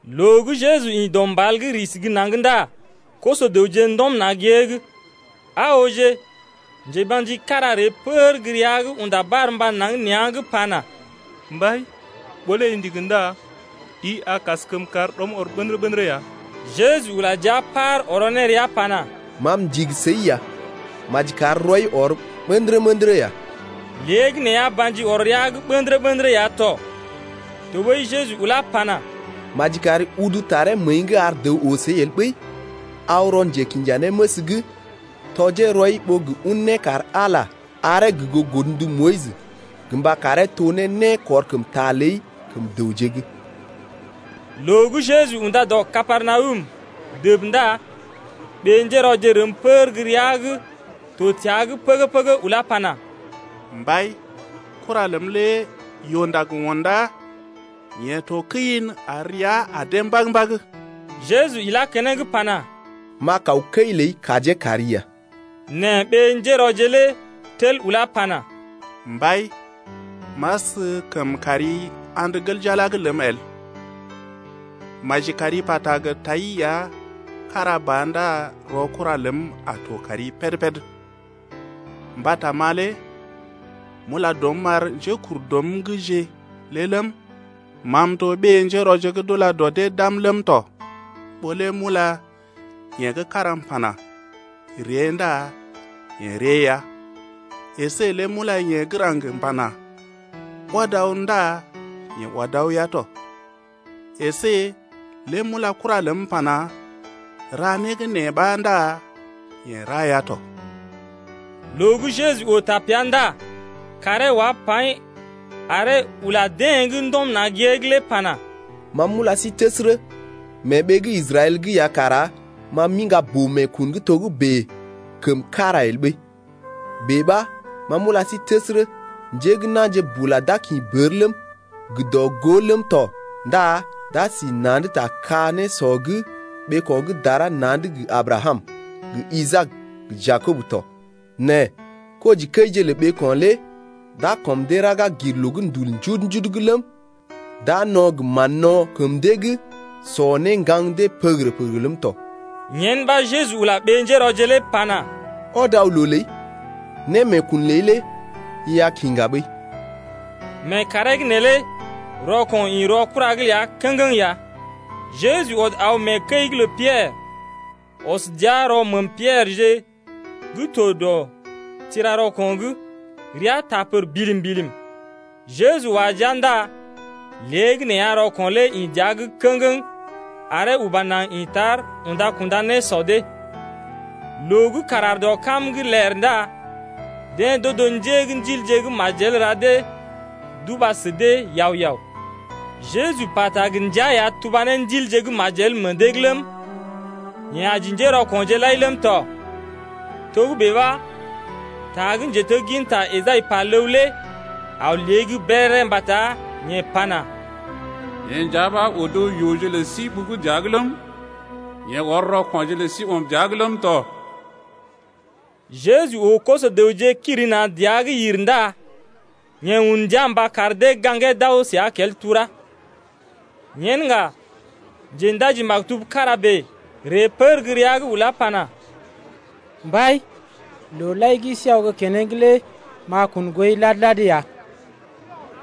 Loo gə́ Jeju ḭ dɔ mbal’g risi gə́ naŋg ndá koso-dəwje ndɔm na̰ gée’g. Aa ooje njeba̰ji kára ree pər gə́ rəa’g unda barmba naŋg nea̰’g pana: Mbai, ɓó lé i ndigi ndá i kaskəm kar rɔm ɔr ɓə̰dərə-ɓə̰dərə ya. Jeju ula jia paar ɔrɔ ne rəa pana: Ma m’ndigi səi ya, maji kar rɔi ɔr ɓə̰dərə-ɓə̰dərə ya. Léegəneeya ba̰ji ɔr rəa’g ɓə̰dərə-ɓə̰dərə ya tɔ. Tɔɓəi Jeju ulá pana: Maji kari udu taree məəi’g ar dəw oo səi el ɓəi, nɛ aw rɔ njekinjanéməs’g tɔjee rɔi ɓó gə un nékar-Ala aree gə goo godndu Moyis gə mba karee to ne nékɔrkəmta ləi kəm dəwje’g ɓa. Loo gə́ Jeju unda dɔ Kapernawum dəb ndá ɓé-njérɔje rəm pər gə́ rəa’g to təa’g pəgə-pəgə ulá pana: Mbai, kura ləm lé yoo-ndag undá, yeḛ to kəi’n ar rəa adee mbag-mbag. Jeju ilá keneŋ pana: M’a kaw kəi ləi kajee kari ya. Nɛ ɓé-njérɔje lé tel ulá pana: Mbai, m’askəm kari andə gel jala’g ləm el. Maji kari pata gə tai ya kára ba ndá rɔ kura ləm a to kari péd-péd. Mbata ma lé m’ula dɔm m’ar njékurdɔm’gje lé ləm, ma m’to ɓé-njérɔje gə́ d’ula dɔ dee d’am ləm tɔ. Ɓó lé m’ula yeḛ gə́ kára m’pana: Ree ndá yeḛ ree ya, əsé lé m’ula yeḛ gə́ raŋg m’pana: Ɔd aw ndá yeḛ ɔd aw ya tɔ, əsé lé m’ula kura ləm m’pana: Ra né gə́ nee ɓa ndá yeḛ ra ya tɔ. Loo gə́ Jeju oo tapea ndá kaaree wá paḭ aree ula deḛ gə́ ndɔm na̰ gée’g lé pana: Ma m’ula sí təsərə, mee ɓee gə́ Israɛl’g ya kara ma m’iŋga boo-meekun gə́ togə́bè kəm kára el ɓəi. Bèe ɓa ma m’ula sí təsərə, njé gə́ na̰je bula d’a kḭ bər ləm, gə dɔ-gó ləm tɔ ndá d’a si na̰’d ta ka-nésɔ’g ɓeeko̰ gə́ dara na̰’d gə Abrakam, gə Isaak, gə Jakob tɔ. Nɛ kojikəije lə ɓeeko̰ lé d’a kɔm dee raga gir loo gə́ ndul njudu-njudu’g ləm, d’a no̰ gə mán-no̰ kəm dee’g sɔ ne ŋgaŋ dee pəgərə-pəgərə ləm tɔ. Tɔɓəi Jeju ula ɓé-njérɔje lé pana: Ɔd aw loo ləi, némeekun ləi lé i a kiŋga ɓəi. Mee kàree’g neelé rɔko̰ ḭ rɔ kura’g ləa kə̰geŋ ya. Jeju ɔd aw mee kəi’g lə Piɛrə, ɔs dəa rɔ məəm Pierəje gə́ to dɔ tira rɔko̰’g, rəa taa pər bilim-bilim. Jeju wa jia ndá léegəneeya rɔko̰ lé ḭ dəa’g kə̰geŋ aree uba naŋg ḭ tar unda-kunda nésɔ dee. Loo gə́ kàr aar dɔ kam’g ler ndá deḛ d’odo njé gə́ ndilje gə́ majel ra dee d’uba sə dee yao-yao. Jeju pata gə ndia ya tuba ne ndilje gə́ majel meḛ dee’g ləm, yeḛ aji njérɔko̰je lai ləm tɔ. Togə́bè ɓa ta gə́ njetegginta Esai pa ləw lé aw lée’g béréré mbata yeḛ pana: Yeḛ nja ɓa odo rɔ yooje lə sí ɓugu dəa’g ləm, yeḛ ɔr rɔko̰je lə sí ɔm dəa’g ləm tɔ. Jeju oo koso-dəwje kiri na̰ dəa’g yir ndá yeḛ un ndia mba kar dee gaŋgee d’aw səa kel tura. Yen ŋga njendaji-maktub kára bèe ree pər gə́ rəa’g ulá pana: Mbai, looje lai gə́ i sí aw gə́ keneŋ lé m’a kun gooi lad-lad ya.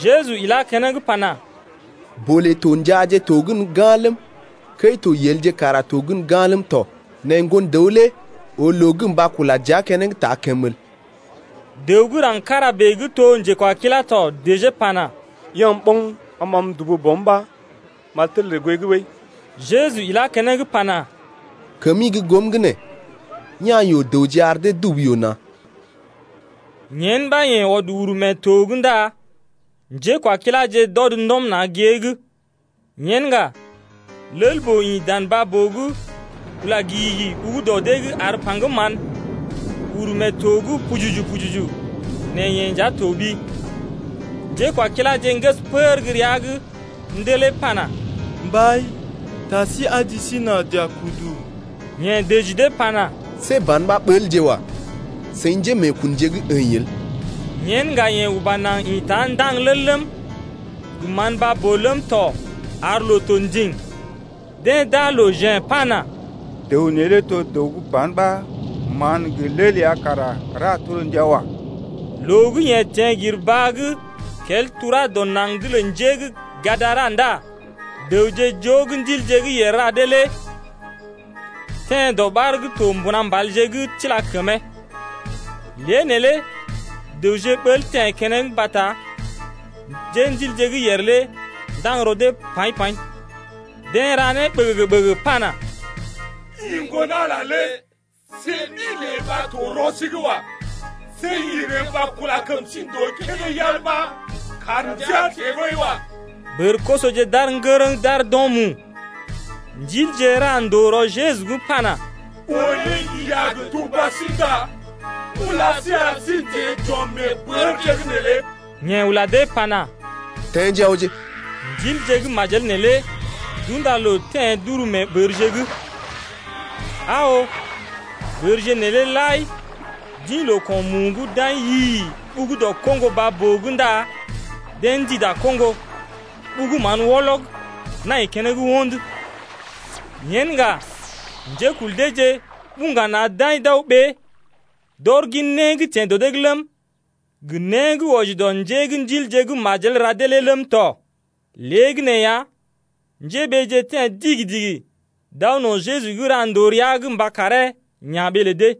Jeju ilá keneŋ pana: Bolé to njaaje to gən ga̰ ləm, kəi to yelje kara to gən ga̰ ləm tɔ. Nɛ Ŋgon-dəw lé oo loo gə́ mba kula dəa keneŋ taa kəmə el. Dəw gə́ raŋg kára bèe gə́ to njekwakilá tɔ dəjee pana: Ya̰’m ɓoŋ am m’aw m’dubu bɔm ɓa m’a tel ree gooi’g ɓəi. Jeju ilá keneŋ pana: Kəmi gə́ goom’g nee, ya̰ yoo-dəwje ar dee dubu yoo na̰. Jeju ɔd uru mee to’g ndá njékwakiláje d’ɔd ndɔm na̰ gée’g. Yen ŋga, lel-boo ḭ dan baa-boo’g ula gigigi ɓugu dɔ dee’g ar paŋgəm mán uru mee to’g pujuju-pujuju nɛ yeḛ lé to toɓi. Njékwakiláje ŋgəs pər gə́ rəa’g ndelee pana, Mbai, taa sí aji sí nà j’a kudu. Yeḛ dəji dee pana: See ban ɓa ɓəlje wa, seḭ njémeekunje gə́ əḭ el. Yen ŋga yeḛ uba naŋg ḭta ndaŋg lel ləm, gə mán baa-boo ləm tɔ ar loo to ndiŋ. Deḛ d’aa loo jḛ̀ pana: Dəw neelé to dəw gə́ ban ɓa mán gə lel ya kara ra torndia wa. Loo gə́ yeḛ teḛ gir baa gə́ kel tura dɔ naŋg’d lə njé gə́ Gadara ndá dəwje joo gə́ ndilje gə́ yèr ra dee lé teḛ dɔɓar gə́ to mbuna mbalje’g tila kəmee. Lée neelé dəwje ɓəl teḛ keneŋ mbata njéndilje gə́ yèr lé ndaŋg rɔ dee paḭ-paḭ. Deḛ ra né ɓəgəgə-ɓəgəgə pana: I Ŋgon-Ala lé see ɗi ləi ɓa to rɔ sí’g wa. See i ree mba kula kəm sí ndòo kédé yal ɓa kar ndəa teḛ ɓəi wa. Bər-kosoje d’aar ŋgərəŋ d’aar d’o̰ mu. Ndilje lé ra ndòo rɔ Jeju’g pana: Ɓó lé i a gə tuba sí ndá ula sí ar sí n’teḛ j’ɔm mee bərje’g neelé. Yeḛ ula dee pana, Teḛje awje! Ndilje gə́ majel neelé d’unda loo teḛ d’uru mee bərje’g. Aa oo, bərje neelé lai d’ḭ loo-ko̰-mu’g d’aḭ yi-i-i d’aw dɔ koŋgo baa-boo’g ndá deḛ ndida koŋgo, ɓugu mán wɔlɔg nai keneŋ wo̰d. Yen ŋga njékul deeje buŋga na̰ d’aḭ d’aw ɓée d’ɔr gin né gə́ teḛ dɔ dee’g ləm, gə né gə́ wɔji dɔ njé gə́ ndilje gə́ majel ra dee lé ləm tɔ. Léegəneeya njéɓeeje teḛ digi-digi d’aw no̰ Jeju’g ra ndòo rəa’g mba karee ya̰ ɓee lə dee.